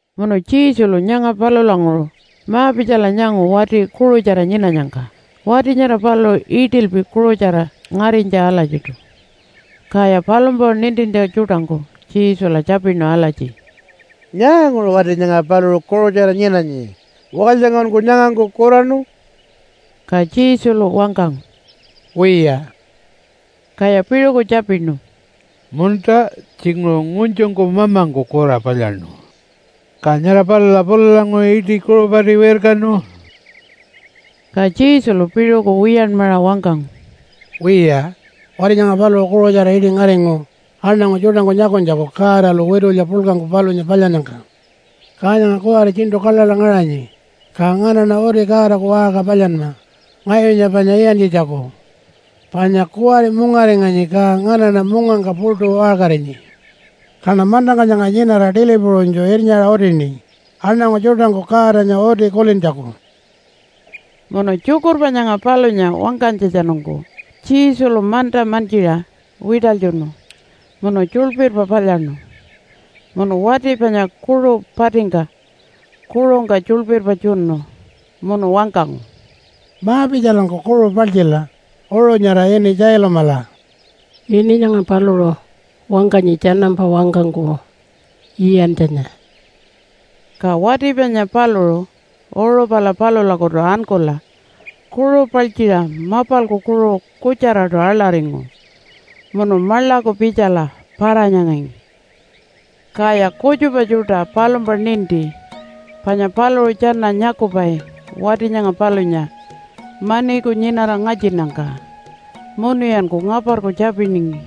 Munu Jesulu nyanga palulanguṟu ma-pitjala nyangu wati kuṟutjara nyinanyangka. Wati nyara paluṟu iṯilpi kuṟutjara ngarinytja alatjiṯu. Kaya palumpa nintintja tjuṯangku Jesula tjapinu alatji, “Nyaanguṟu wati nyanga paluṟu kuṟutjara nyinanyi? Walytjangkunku nyangangku kuraṉu?” Ka Jesulu wangkangu, “Wiya.” Kaya piṟuku tjapinu, “Munta, tjinguṟu ngunytjungku mamangku kura palyaṉu, ka nyara palula pulalanguṟu iṯi kuṟu pati wirkanu?” Ka Jesulu piṟuku wiyanmaṟa wangkangu, “Wiya, wati nyanga paluṟu kuṟutjara iṯi ngaringu aṉangu tjuṯangku nyakunytjaku Godalu witulya puḻkangku palunya palyannyangka. Ka nyanga kuwari tjiṉṯu kaḻaḻa ngaṟanyi, ka nganaṉa uti Godaku waṟka palyanma ngayunya panya iyantjitjaku. Panya kuwari mungaringanyi, ka nganaṉa mungangka puṯu waṟkarinyi. Kaṉa mantangka nyanga nyinara tili puṟunytju irnyaṟa utini aṉangu tjuṯangku Godanya uti kulintjaku.” Munu tjukurpa nyanga palunya wangkanytjatjanungku Jesulu manta mantjiṟa wiṯalytjunu munu tjuḻpirpa palyaṉu. Munu wati panya kuṟu patingka kuṟungka tjuḻpirpa tjunu. Munu wangkangu, “Ma-pitjalanku kuṟu paltjila uṟu nyara ini Tjailumala.” (Ini nyanga paluṟu wangkanyi tjanampa wangkangku, Iyantjanya.) Ka wati panya paluṟu uṟu pala palulakutu ankula kuṟu paltjiṟa mapalku kuṟu kutjaraṯu aḻaringu munu maḻaku pitjala para-nyangangi. Kaya kutjupa tjuṯa palumpa ninti panya paluṟu tjana nyakupai wati nyanga palunya maniku nyinara ngatjinnyangka. Munuyanku ngaparku tjapiningi,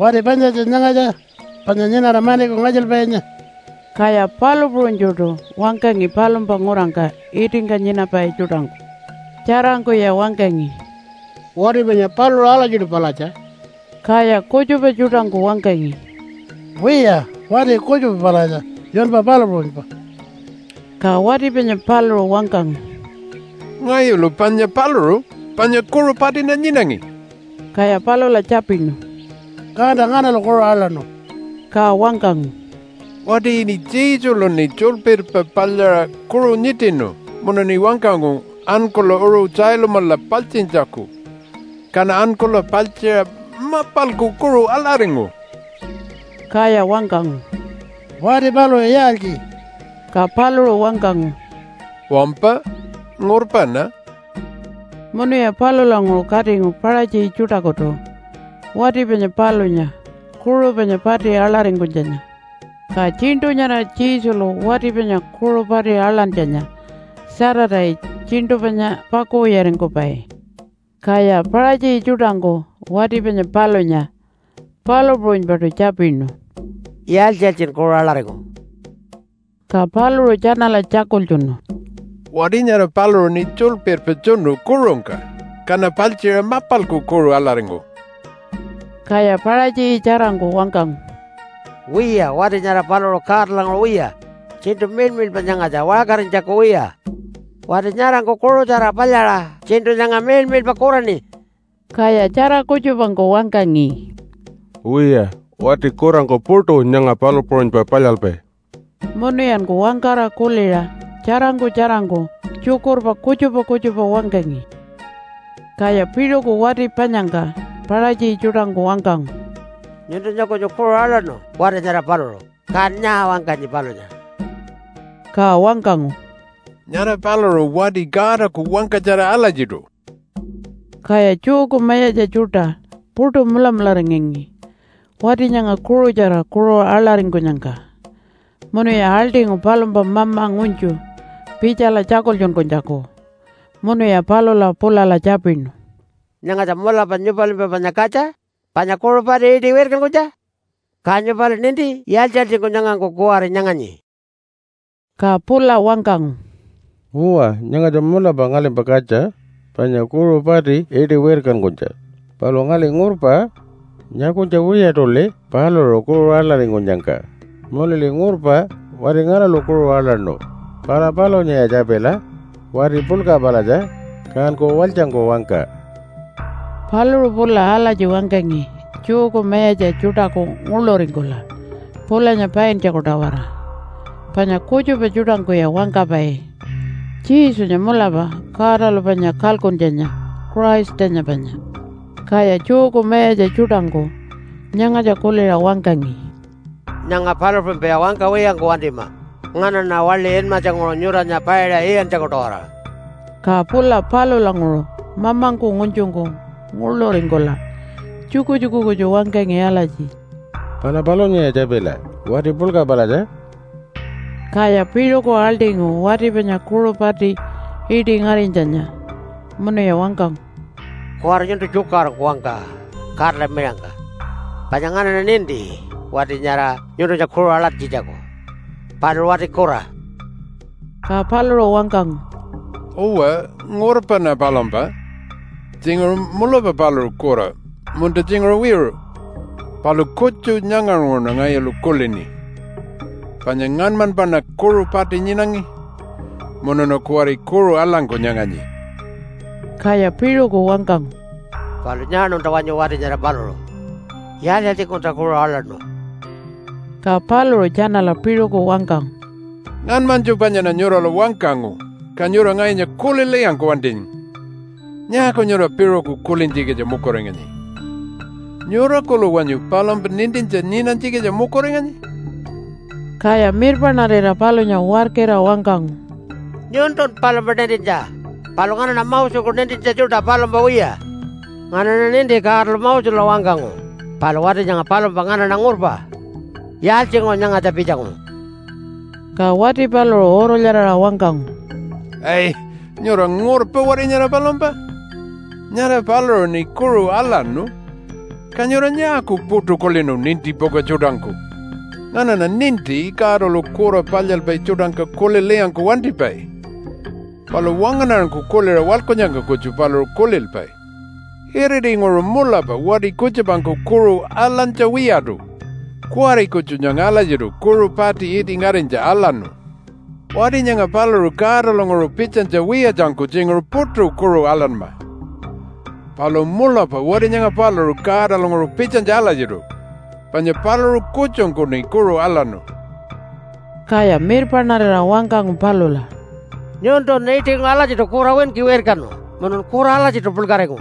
“Wati panyatja nyangatja? Panya nyinara maniku ngatjilpainya?” Kaya palu puṟunytjuṯu wangkangi palumpa ngurangka itingka nyinapai tjuṯangku. Tjarangkuya wangkangi, “Wati panya paluṟu alatjiṯu palatja.” Kaya kutjupa tjuṯangku wangkangi, “Wiya, wati kutjupa palatja, yunpa palu puṟunypa.” Ka wati panya paluṟu wangkangu, “Ngayulu panya paluṟu, panya kuṟu patiṉa nyinangi.” Kaya palula tjapinu, “Kanta nganalu kuṟu aḻaṉu?” Ka wangkangu, “Wati ini Jesuluṉi tjuḻpirpa palyaṟa kuṟu nyiṯinu munuṉi wangkangu ankula uṟu Tjailumala paltjintjaku. Kaṉa ankula paltjiṟa mapalku kuṟu aḻaringu.” Kaya wangkangu, “Wati paluṟu yaaltji?” Ka paluṟu wangkangu, “Wampa, ngurpaṉa.” Munuya palulanguṟu katingu Paṟatji tjuṯakutu wati panya palunya kuṟu panya pati aḻaringkunytjanya. (Ka tjiṉṯu nyara Jesulu wati panya kuṟu pati aḻantjanya Saturday tjiṉṯu panya pakuwiyaringkupai.) Kaya Paṟatji tjuṯangku wati panya palunya palu puṟunypaṯu tjapinu, “Yaaltji-yaaltjin kuṟu aḻaringu?” Ka paluṟu tjanala tjakultjunu, “Wati nyara paluṟuṉi tjuḻpirpa tjunu kuṟungka, kaṉa paltjiṟa mapalku kuṟu aḻaringu.” Kaya Paṟatji tjarangku wangkangu, “Wiya, wati nyara paluṟu Godalanguṟu wiya. Tjiṉṯu miḻmiḻpa nyangatja, waṟkarinytjaku wiya. Wati nyarangku kuṟutjara palyaṟa tjiṉṯu nyanga miḻmiḻpa kuraṉi.” Kaya tjara kutjupangku wangkangi, “Wiya, wati kurangku puṯu nyanga palu puṟunypa palyalpai.” Munuyanku wangkara kuliṟa tjarangku tjarangku tjukurpa kutjupa kutjupa wangkangi. Kaya piṟuku wati panyangka Paṟatji tjuṯangku wangkangu, “Nyuntunya kunyu kuṟu aḻaṉu wati nyara paluṟu, kan nyaa wangkanyi palunya?” Ka wangkangu, “Nyara paluṟu wati Godaku wangkatjara alatjiṯu.” Kaya Jewku mayatja tjuṯa puṯu mulamularingangi wati nyanga kuṟutjara kuṟu aḻaringkunyangka. Munuya aḻṯingu palumpa mama ngunytju pitjala tjakultjunkunytjaku. Munuya palula pulala tjapinu, “Nyangatja mulapa nyupalimpa panya katja? Panya kuṟu pati iṯi wirkankunytja? Ka nyupali ninti yaaltji-yaaltjingku nyangangku kuwari nyanganyi?” Ka pula wangkangu, “Uwa, nyangatja mulapa ngalimpa katja, panya kuṟu pati iṯi wirkankunytja. Palu ngali ngurpa. Nyakunytja wiyaṯuli paluṟu kuṟu aḻaringkunyangka. Munuli ngurpa wati nganalu kuṟu aḻaṉu. Pala palunyaya tjapila. Wati puḻka palatja, kanku walytjangku wangka.” Paluṟu pula alatji wangkangi Jewku mayatja tjuṯaku nguḻuringkula pulanya paintjaku-tawara. Panya kutjupa tjuṯangkuya wangkapai, “Jesunya mulapa Godalu panya kalkuntjanya, Christanya panya.” Kaya Jewku mayatja tjuṯangku nyangatja kuliṟa wangkangi, “Nyanga palu puṟunypaya wangkawiyangku wantima nganaṉa waḻi inmatjanguṟu nyuranya paiṟa iyantjaku-tawara.” Ka pula palulanguṟu mamangku ngunytjungku nguḻuringkula tjukutjuku kutju wangkangi alatji, “Pala palunyaya tjapila! Wati puḻka palatja.” Kaya piṟuku aḻṯingu wati panya kuṟu pati iṯi ngarinytjanya, munuya wangkangu, “Kuwari nyuntu tjukaṟurungku wangka Godala miṟangka! Panya nganaṉa ninti wati nyara nyuntunya kuṟu aḻantjitjaku. Paluṟu wati kura.” Ka paluṟu wangkangu, “Uwa, ngurpaṉa palumpa. Tjinguṟu mulapa paluṟu kura, munta tjinguṟu wiṟu. Palu kutju nyanganguṟuṉa ngayulu kulini, panya ngaṉmanypaṉa kuṟu pati nyinangi munuṉa kuwari kuṟu aḻangku nyanganyi.” Kaya piṟuku wangkangu, “Palu nyaaṉunta wanyu wati nyara paluṟu? Yaaltji-yaaltjingkunta kuṟu aḻaṉu?” Ka paluṟu tjanala piṟuku wangkangu, “Ngaṉmanytju panyaṉa nyurala wangkangu, ka nyura ngayunya kulilwiyangku wantingi. Nyaaku nyura piṟuku kulintjikitja mukuringanyi? Nyura kuḻu wanyu palumpa nintintja nyinanytjikitja mukuringanyi?” Kaya mirpaṉarira palunya warkira wangkangu, “Nyuntun palumpa nintintja. Palu nganaṉa Moseku nintintja tjuṯa, palumpa wiya. Nganaṉa ninti Godalu Mosela wangkangu, palu wati nyanga palumpa nganaṉa ngurpa. Yaaltjinguṟu nyangatja pitjangu?” Ka wati paluṟu urulyaraṟa wangkangu, “Ai! Nyura ngurpa wati nyara palumpa? Nyara paluṟuṉi kuṟu aḻaṉu, ka nyura nyaaku puṯu kulinu nintipuka tjuṯangku? Nganaṉa ninti Godalu kura palyalpai tjuṯangka kulilwiyangku wantipai. Palu wangaṉarangku kuliṟa waḻkunnyangka kutju paluṟu kulilpai. Iritinguṟu mulapa wati kutjupangku kuṟu aḻantja wiyaṯu, kuwari kutju nyanga alatjiṯu kuṟu pati iṯi ngarinytja aḻaṉu. Wati nyanga paluṟu Godalanguṟu pitjanytja wiyatjangku tjinguṟu puṯu kuṟu aḻanma. Palu mulapa wati nyanga paluṟu Godalanguṟu pitjanytja alatjiṯu, panya paluṟu kutjungkuṉi kuṟu aḻaṉu.” Kaya mirpaṉarira wangkangu palula, “Nyuntun iṯinguṟu alatjiṯu kura winki wirkanu munun kura alatjiṯu puḻkaringu,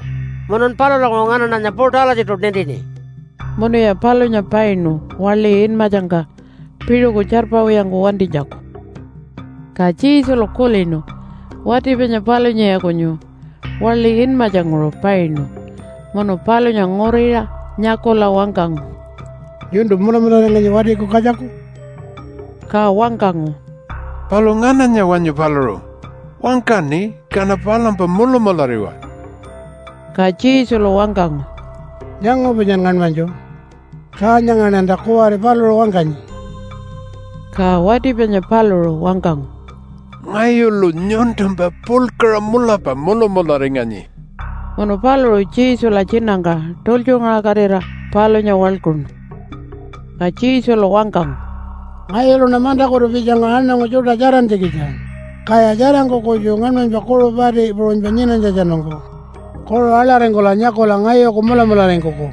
munun palulanguṟu nganaṉanya puṯu alatjiṯu nintini.” Munuya palunya painu waḻi inmatjangka piṟuku tjarpawiyangku wantinytjaku. Ka Jesulu kulinu wati panya palunyaya kunyu waḻi inmatjanguṟu painu munu palunya nguriṟa nyakula wangkangu, “Nyuntu mulamularinganyi Watiku Katjaku?” Ka wangkangu, “Palu ngananya wanyu paluṟu? Wangkaṉi, kaṉa palumpa mulamulariwa.” Ka Jesulu wangkangu, “Nyangu panyan ngaṉmanytju. Ka nyangaṉanta kuwari paluṟu wangkanyi.” Ka wati panya paluṟu wangkangu, “Ngayulu nyuntumpa puḻkaṟa mulapa mulamularinganyi.” Munu paluṟu Jesula tjinangka tultjungaṟakatira palunya waḻkuṉu. Ka Jesulu wangkangu, “Ngayuluṉa mantakutu pitjangu aṉangu tjuṯa tjarantjikitja, kaya tjarangku kutju ngaṉmanypa kuṟu pati puṟunypa nyinanytjatjanungku kuṟu aḻaringkula nyakula ngayuku mulamularingkuku,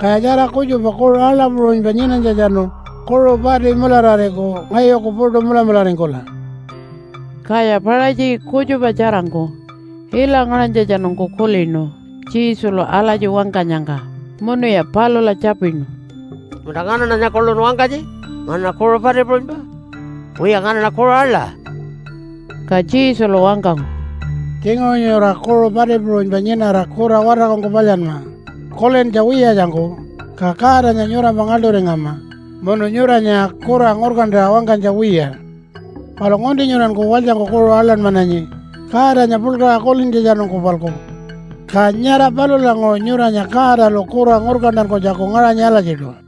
kaya tjara kutjupa kuṟu aḻa puṟunypa nyinanytjatjanu kuṟu pati mularariku ngayuku puṯu mulamularingkula.” Kaya Paṟatji kutjupa tjarangku ila ngaṟanytjatjanungku kulinu Jesulu alatji wangkanyangka, munuya palula tjapinu, “Munta nganaṉanya kuḻun wangkanyi nganaṉa kuṟu pati puṟunypa? Wiya, nganaṉa kuṟu aḻa.” Ka Jesulu wangkangu, “Tjinguṟu nyura kuṟu pati puṟunypa nyinara kura watarkungku palyanma, kulintja wiyatjangku, ka Godanya nyurampa ngaḻṯuringama munu nyuranya kura ngurkantaṟa wangkanytja wiya. Palu ngunti nyuranku walytjangku kuṟu aḻanmananyi Godanya puḻkaṟa kulintjatjanungku-palku. Ka nyara palulanguṟu nyuranya Godalu kura ngurkantankunytjaku ngaṟanyi alatjiṯu.”